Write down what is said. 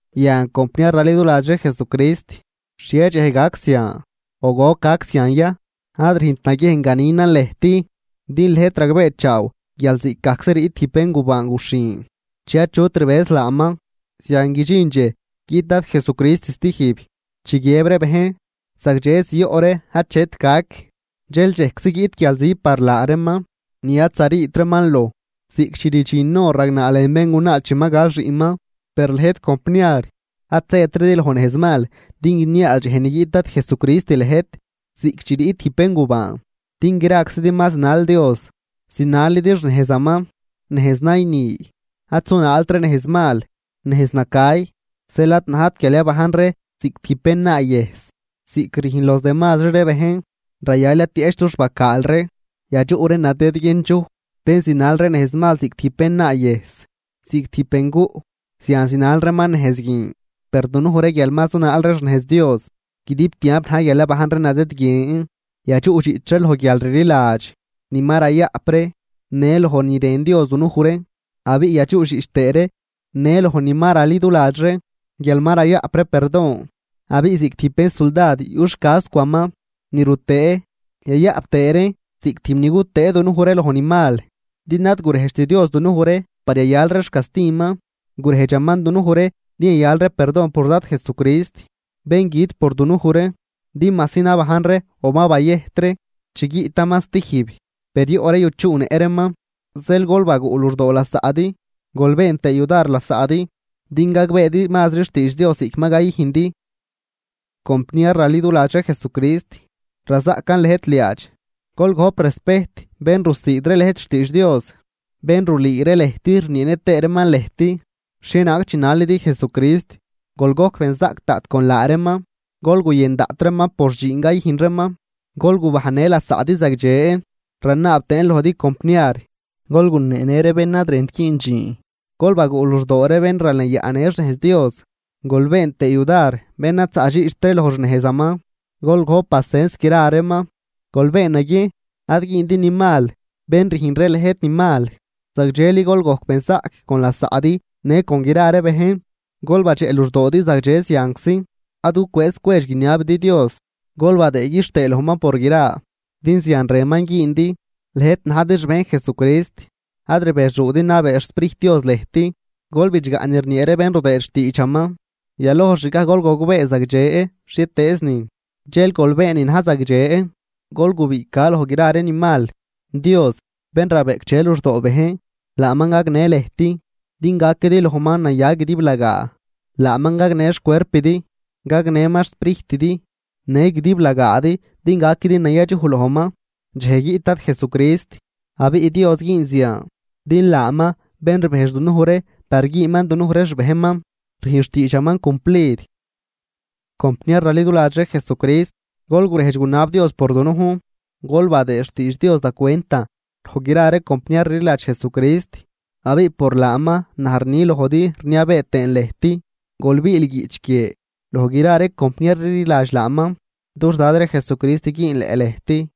Yan, compniar raliduladx ree Jesucrist, xhie dxej gac zian o goc gac zian ya, ad rüjnt naguiejn ganinan lëjt. Din lëjt ragbeechaaw guial ziꞌcgajczi riꞌt tijb béngubaan guxhin, chi achut rbëz laaman, zian guidxin dxej guiꞌt Dad Jesucrist stijb. Chi guiëb ree bejn: “Zagdxe zioꞌ ree, achet gac”, dxel dxejczi guiꞌt guialzi par laa reeman ni ad zariit reeman loj, ziꞌc chi rdxin hor ragnaa lën béngunaa chi ma gal xiꞌnman. Per lëjt compniar, ad zëtridi loj nejzmal din guiniaaz dxej ni guiꞌt Dad Jesucrist lëjt ziꞌc chi riꞌt tijb béngubaan. Din graczidi ma zinal Dios, zinalidi xnejzaman, nejz nayni. Ad zunaalt ree nejz mal, nejz nacay. Zeel ad najt guial yabajn ree ziꞌc tijb bénnaayëjs, ziꞌc rüjn los demazri ree bejn, rayal yatieꞌch dux bacaal ree, yadxuꞌ ree nadëdguiendxuj. Bén zinal ree nejzmal ziꞌc tijb bénnaayëjs, ziꞌc tijb benguꞌ, zian zinal reeman nejz guin. Per dunuj ree, guial ma zunaal ree xnejz Dios, guidib tiamp na̱j guial yabajn ree nadëdguien. Yadxuꞌdxiꞌch ree loj guialrliladx ni ma rayaꞌp ree në loj ni rën Dios dunuj ree, abiꞌ yadxuꞌdxiꞌch tëë ree në loj ni ma raliduladx ree guial ma rayaꞌp ree perdon. Abiꞌ ziꞌc tijb xin suldad yuꞌ xcascwix ni rutëë yayaꞌp tëë reen ziꞌc tijb ni gutëë dunuj ree loj ni mal Din ad gurejdxt Dios dunuj ree par yayal ree xcastiman, gurejdxaman dunuj ree din yayal ree perdon por Dad Jesucrist, bén güt por dunuj ree, din majsi nabajn ree o ma bayëjt ree chi guiꞌtaman stijb, per yoꞌ ree yuchuꞌnëꞌ reeman. Zeel gol baguꞌ luxdoo lasaꞌdi gol been tëë yudar lasaꞌdi din gagbeedi mazri xtiidx Dios ziꞌc ma cayüjndi. Compniar raliduladx ree Jesucrist, razaꞌcan lëjt liaadx, gol gojp respejt bén rusiid ree lëjt xtiidx Dios, bén rulüü ree lëjt rnieenë tëë reeman lëjt xhienaag chinalidi Jesucrist. Gol gojc benzaꞌc daꞌt con laa reeman, gol guyën daꞌt reeman por dxiin cayüjn reeman. Gol gubajnnë lasaꞌdi zagdxe. Ranaab tëën lojdi compniar, gol guneenë ree bén ad rënt güün dxiin, gol baguꞌ luxdoo ree bén ralenyaꞌnë xnejz Dios, gol been tëë yudar bén ad zaꞌdxiꞌcht ree loj xnejzaman, gol gojp pacens gra reeman. Gol been naguiejn ad güündi ni mal bén rüjn ree lëjt ni mal, zagdxeli gol gojc benzaꞌc con lasaꞌdi në con gra ree bejn. Gol badxeꞌ luxdoodi zagdxe zianczi. Ad gucwëëz cwedx guiniabidi Dios. Gol badëë quixtëë lojman por gra, din zian rënman güündi, lëjt najdi xbejn Jesucrist. Ad rbexuudi nabee xSprijt Dios lëjt. Gol bidxgaꞌ ni rniee ree bén rudëëd xtiidxaman. Yaloj xgaj gol gogbee zagdxe xhietëëznin, dxel gol been ni na̱j zagdxe. Gol gubiꞌca loj gra ree ni mal. Dios, bén rabeꞌcdxe luxdoo bejn, laaman gagnë lëjt din gaquidi lojman naya guidiblagaa. Laaman gagnë xcuerpidi, gagnëman xsprijtidi në guidiblagaadi din gaquidi nayadxuj lojman dxej guiꞌt Dad Jesucrist. Abiꞌ Dios güün zian, din laaman, bén rbejdx dunuj ree par güünman dunuj ree xbejnman, rüjn xtiidxaman cumplid. Compniar raliduladx ree Jesucrist, gol gurejdx gunab Dios por dunujn. Gol badëë xtiidx Dios da cwentan loj gra ree compniar rliladx Jesucrist. Abiꞌ por laaman, naj rni lojdi rniabee tëën lëjt: Gol biil guiꞌch guie loj gra ree compniar rliladx laaman. Dux Dad ree Jesucrist güünleꞌ lëjt.